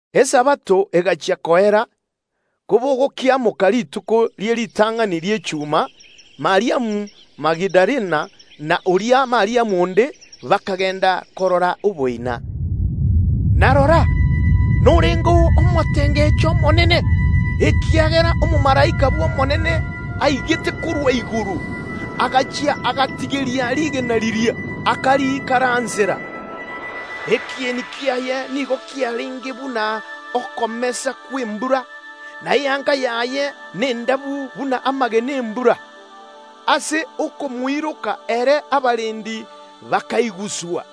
Esabato egachia koera, kobogokiamoka rituko ria Jumapili, Mariamu Magadalena na oria Mariamu onde bakagenda korora oboina. Na rora, norengeo omotengecho omonene, ekiagera omomalaika bw’Omonene aigete korwa igoro, agachia agatigeria rigena riria, akariikaransera. Ekieni kiaye nigo kiarenge buna okomesa kw’embura, na eyanga yaye nendabu buna amagena y’embura. Ase okomoiroka ere abarendi bakaiguswa,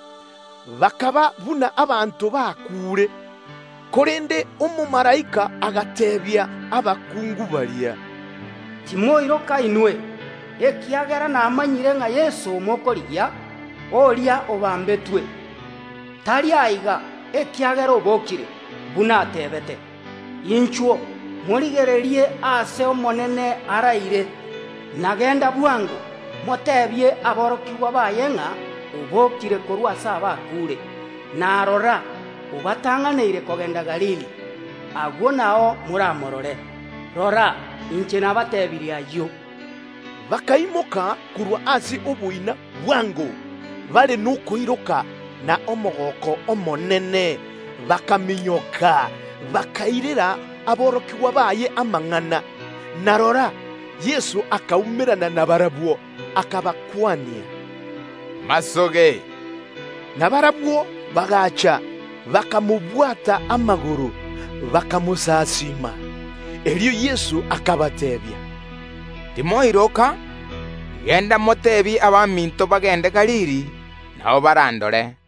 bakaba buna abanto bakuure. Korende omomalaika agateebia abakungu baria, “Timoiroka inwe, ekiagera namanyire ng’a Yeso mokorigia, oria obambetwe. Tari aiga, ekiagera obokire, buna ateebete. Inchuo, morigererie aase Omonene araire. Na genda bwango, moteebie aborokigwa baye ng’a obokire korwa ase abakuure; na rora, obatang’aneire kogenda Galili; agwo nao moramorore. Rora, inche nabatebirie ayio.” Bakaimoka korwa ase oboina bwango, bare nokoiroka na omogooko omonene, bakaminyoka, bakairera aborokigwa baye amang’ana. Na rora, Yeso akaumerana na barabwo, akabakwania, “Omorembe obe nainwe!” Na barabwo bagaacha, bakamobwata amagoro, bakamosasiima. Erio Yeso akabateebia, “Timoiroka! Genda moteebie abaminto bagende Galili, nao barandore.”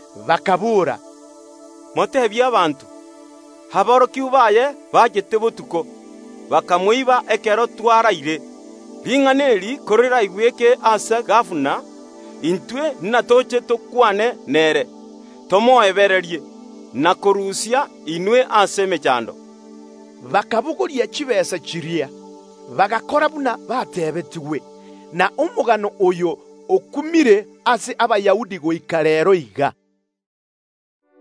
bakaboora, “Moteebie abanto: Aborokigwa baye mbachete botuko, bakamoiba ekero twararire. Ring’ana eri koriraigweke ase gabana, intwe natoche tokwane nere, tomoebererie, na kobarusia inwe ase emechando.” Bakabogoria chitaabu chiria, bagakora buna bateebetigwe, na omogano oyo okumire ase Abayahudi goika reero iga.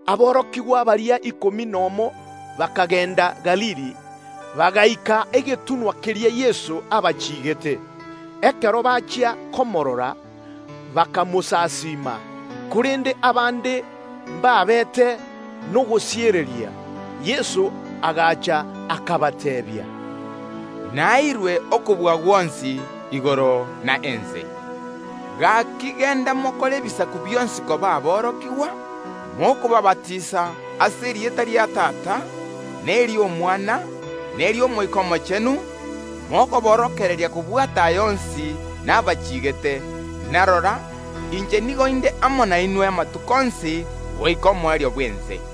Aborokigwa baria ikomi nomo bakagenda Galili, bagaika egetunwa keria Yeso abachiigete. Ekero bachia komorora, bakamosasiima; korende abande mbabete n’echitang’utang’u. Yeso agacha ange nabarabwo akabateebia, “Naeirwe okobua gwonsi igoro na ense. Gaki genda mokore ebisaku bionsi koba aborokigwa, mokobaabatisa ase erieta ria Tata, neri’Omwana, neri’Omoika Omochenu, mokoborokereria kobwata aya onsi nabachiikire; na rora, inche nigo inde amo nainwe amatuko onsi goika omoerio bw’ense.”